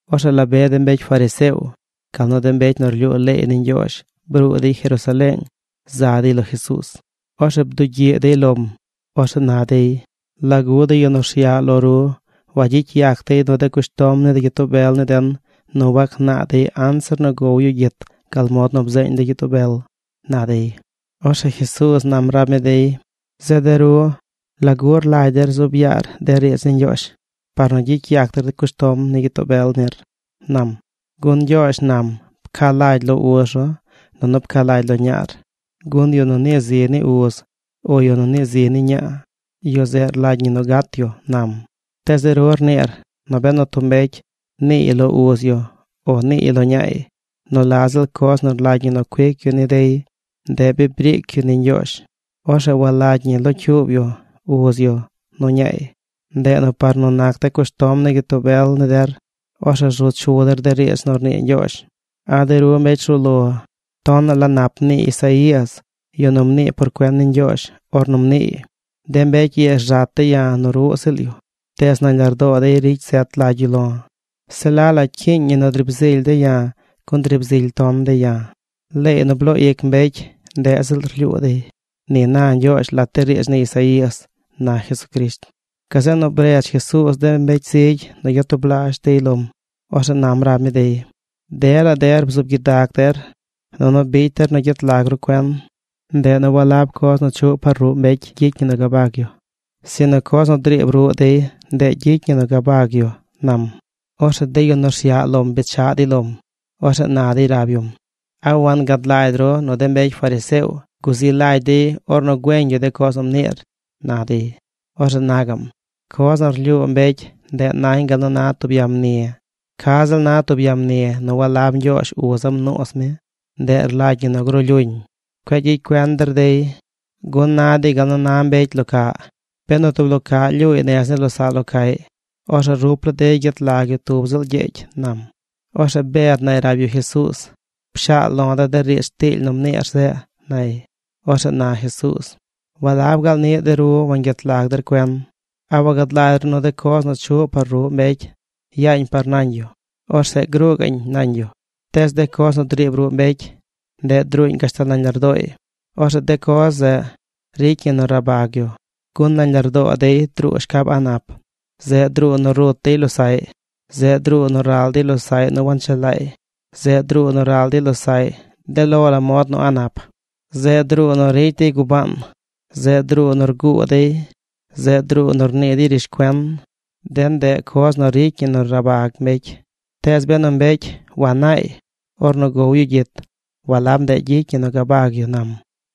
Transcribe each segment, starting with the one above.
Orzeꞌ la be de mbecy fariseo, gal nu de mbecy nu rlyuu leey ni Ñgyoozh bruu dey Jerusaleeng za dey lo Jesuuz. Orzeꞌ bdugyiꞌ dey lom. Orzeꞌ na dey: ―¿Lagu de yu nu rsyaꞌ lo ru wagyicy yac dey nu de cushtom ni de gyitoo bel ni den nu wagnaa dey anzir nu gow yu gyit gal mod nu bzeeñ de gyitoo bel? ―na dey. Orzeꞌ Jesuuz nam rab mi dey: ―Zeꞌ de ru, ¿lagu rlagy der zuub yaar de riidz ni Ñgyoozh par nu gyicy yac der cushtom ni gyitoo bel nir? ―nam. ―Gun Ñgyoozh nam: “Pca lagy lo uz ru nunu pca lagy ru lo ñaar, gun yu nu nii zi ni uz o yu nu nii zi ni ñaa, yu zeꞌ rlagy ñi nu gat yu”, nam. Tees de ru rniir nu benu tub mbecy niiy lo uz yu o niiy lo ñaay nu la ziꞌl coz nu rlagy ñi cuic yu ni dey, ndeꞌ bi briic yu ni Ñgyoozh. Orzeꞌ walagy ñi locyuub yu uz yu nu ñaay. Ndeꞌ nu par nu nac de cushtom ni gyitoo bel ni der, orzeꞌ rzu chu der de riidz nu rnii Ñgyoozh. ¡A de ru mbecy rzuu lo! Tonaꞌ la nap mnii Isaías, yu nu mnii por cuen ni Ñgyoozh, ornu mniiy: De mbecy ii rzat dey ya̱ nu ruꞌ ziꞌl yu. Tees nañ lardoo dey ricy zet lagy yu lo̱. Se la la cyiiñ ñi nu driib zily dey ya̱ gun driib zily ton dey ya̱. Leey nu bloo ic mbecy, ndeꞌ ziꞌl rlyuu dey. Ni na Ñgyoozh lat de riidz ni Isaías ―na Jesucrisht. Gazeꞌ nu bredz Jesuuz de mbecy zigy nu gyatublaazh dey lom. Orzeꞌ nam rab mi dey: ―Dela der bzuub gyidag der, nunu bicy der nu gyet lag ru cuen. Ndeꞌ nu walab coz nu chuꞌ par ruꞌ mbecy gyicy ñi nu gabag yu, sinu coz nu driib ruꞌ dey, ndeꞌ gyicy ñi nu gabag yu ―nam. Orzeꞌ de yu nu rsyaꞌ lom bechaꞌ dey lom. Orzeꞌ na dey rab yum: ―¿A wangad lagy ru nu de mbecy fariseo guzi lagy dey ornu güeñ yu de coz nu mniir? ―na dey. Orzeꞌ na gaꞌm: ―Coz nu rlyuu mbecy, ndeꞌ nañ gal nu na tub ya mni. Ca ziꞌl na tub ya mni nu walab Ñgyoozh uza̱ mnuuz mi, ndeꞌ rlagy ñi nu gruu lyuñ. Cueꞌ gyicy cuen der dey, gun na dey gal na mbecy locaꞌ. Benu tub lo caꞌ lyuuy nez ni losaꞌ lo caꞌy, orzeꞌ rup laa dey gyet lag yu tub ziꞌl gyegy ―nam. Orzeꞌ Bed nay rab yu Jesuuz: ―Pshaal lo de̱ de riidz tiily nu mniir zeꞌ ―nay. Orzeꞌ na Jesuuz: ―¿Walab gaal niꞌ de ru wangyet lag der cuen? ¿A wagad lagy ru nu de coz nu chuꞌ par ruꞌ mbecy yaañ par nañ yu? Orzeꞌ gruu gaꞌñ nañ yu. Tees de coz nu driib ruꞌ mbecy, ndeꞌ druuñ gashtal nañ lardooy. Orzeꞌ de coz zeꞌ ricy ñi nu rabag yu. Gun nañ lardoo dey druu shcab a̱ꞌ nap. Zeꞌ druu nu rut dey losaꞌy. Zeꞌ druu nu ral dey losaꞌy nu wanchelaay. Zeꞌ druu nu ral dey losaꞌy de lo la mod nu a̱ꞌ nap. Zeꞌ druu nu ricy dey gubaan. Zeꞌ druu nu rguu dey. Zeꞌ druu nu rnii dey rishcuen. De ndeꞌ coz nu ricy ñi nu rabag mbecy. Tees benu mbecy wanaay ornu gow yu gyit, walab ndeꞌ gyicy ñi nu gabag yu ―nam.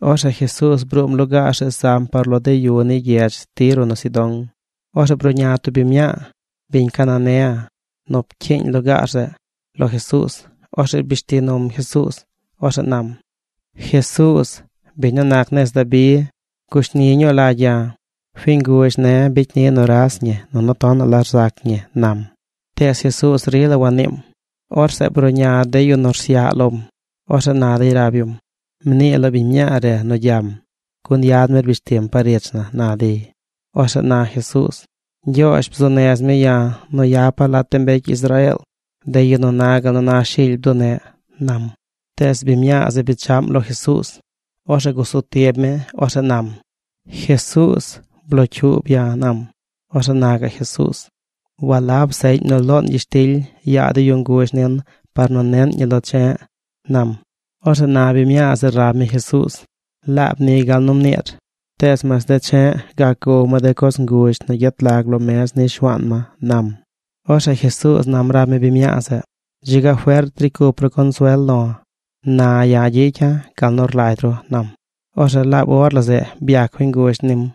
Orzeꞌ Jesuuz bruum lugaar zeꞌ zam par lo de yu ni gyedz Tiro nu Sidón. Orzeꞌ bruꞌña tub biñ mñaa, biñ Cananea nu pcyiiñ lugaar zeꞌ, lo Jesuuz. Orzeꞌ rbish ti num Jesuuz. Orzeꞌ nam: ―¡Jesuuz, biñ nu nac nez Dabi, gushni ñuu lagy ya̱! Fiñ guzh ne̱ bicy ni nuras ñi nunu tonaꞌ la rzac ñi ―nam. Tees Jesuuz rila waniim. Orzeꞌ bruꞌña de yu nu rsyaꞌ lom. Orzeꞌ na dey rab yum: ―Mnii lo biñ mñaa re nu gyam, gun yad mi rbish tim par ich na ―na dey. Orzeꞌ na Jesuuz: ―Ñgyoozh bzuu nez mi ya̱ nu yapa̱ lat de mbecy Israeel, de yu nu na gal nu na shily bduneꞌ ―nam. Tees biñ mñaa zeꞌ bechaꞌm lo Jesuuz. Orzeꞌ gusu tib mi. Orzeꞌ nam: ―Jesuuz, blocyuub ya̱ ―nam. Orzeꞌ na gaꞌ Jesuuz: ―Walab seꞌñ nu loon gyishtily yaa de yu nguzh nin par nu neꞌn ñi lo che̱ꞌ ―nam. Orzeꞌ na biñ mñaa zeꞌ rab mi Jesuuz: ―Laab ni gal nu mniir. Tees mas de che̱ꞌ gac gow ma de coz nguzh nu gyet lag lo mez ni shuaan ma ―nam. Orzeꞌ Jesuuz nam rab mi biñ mñaa zeꞌ: ―¡Dzi ga fert ricy cup ru consuel lo̱! Na ya̱ gyicya̱ gal nu rlagy ru ―nam. Orzeꞌ laab or la zeꞌ byac fiñ nguzh nim.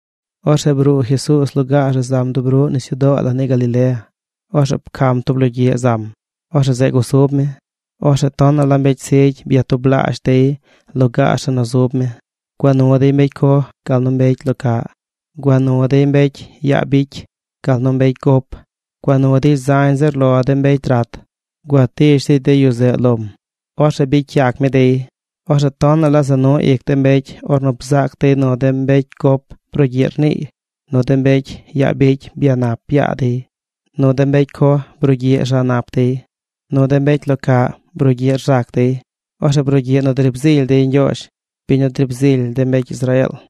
Orzeꞌ bruu Jesuuz lugaar zeꞌ zam dub ruꞌ nisyudoo la ni Galilea. Orzeꞌ pcam tub logyiꞌ zam. Orzeꞌ zeꞌ gusub mi. Orzeꞌ tonaꞌ la mbecy zigy byatublaazh dey lugaar zeꞌ nu zub mi. Gua nu dey mbecy coj, gal nu mbecy lo caꞌ. Gua nu dey mbecy yaa bicy, gal nu mbecy gop. Gua nu dey zañ zir lo de mbecy rat. Gua tish dey de yu zeꞌ lom. Orzeꞌ bicy yac mi dey. Orzeꞌ tonaꞌ la za nu ic de mbecy ornu bzaac dey nu de mbecy gop brugyiꞌ rniiy; nu de mbecy yaa bicy byanap yaa dey; nu de mbecy coj brugyiꞌ rza nap dey; nu de mbecy lo caꞌ brugyiꞌ rzac dey. Orzeꞌ brugyiꞌ nu driib zily dey Ñgyoozh, biñ nu driib zily de mbecy Israeel.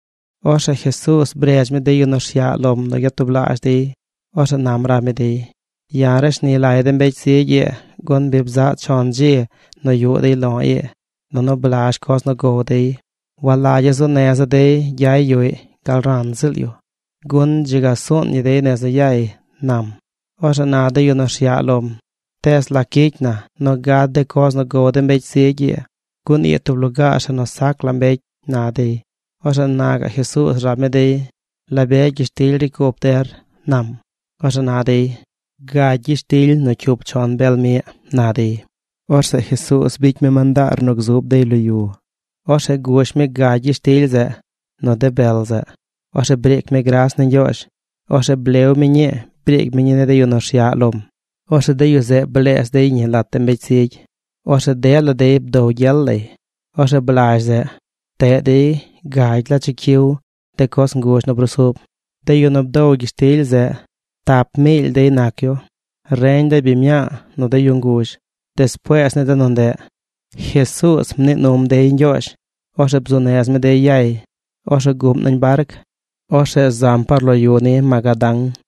Orzeꞌ Jesuuz bredz mi de yu nu rsyaꞌ lom nu gyatublaazh dey. Orzeꞌ nam rab mi dey: ―Ya̱ rashni lagya̱ de mbecy zigy ii gun bi bzaꞌ chon dzi nu yuꞌ dey lo̱ ii, nunu blazh coz nu gow dey. Walagya̱ zuu neza̱ dey gyay yuꞌy gal ran ziꞌl yu, gun dzi ga suun ñi dey nez nu yay ―nam. Orzeꞌ na de yu nu rsyaꞌ lom: ―¿Tees lac gyicy na nu gad de coz nu gow de mbecy zigy ii? Gun ii tub lugaar zeꞌ nu sac la mbecy ―na dey. Orzeꞌ na gaꞌ Jesuuz rab mi dey: ―¿La be gyishtily ricy cup der? ―nam. Orzeꞌ na dey: ―Gagy gyishtily nu cyup chon bel miꞌ ―na dey. Orzeꞌ Jesuuz bicy mi mandaar nu gzub dey lo yu. Orzeꞌ gush mi gagy gyishtily zeꞌ nu de bel zeꞌ. Orzeꞌ briic mi gras ni Ñgyoozh. Orzeꞌ blew mi ñii briic mi ni de yu nu rsyaꞌ lom. Orzeꞌ de yu zeꞌ bleez dey ñi lat de mbecy zigy. Orzeꞌ dela dey bdow gyel lay. Orzeꞌ blazh zeꞌ, pteꞌ dey gagy la chicyiw de coz ngush nu brusub. De yu nu bdow gyishtily zeꞌ tap miily dey nac yu. Reñ de biñ mñaa nu de yu nguzh. Despuees ni de nu ndeꞌ, Jesuuz mnii num dey ñgyoozh. Orzeꞌ bzuu nez mi dey yay. Orzeꞌ guꞌm nañ barc. Orzeꞌ zam par lo yu ni Magadán.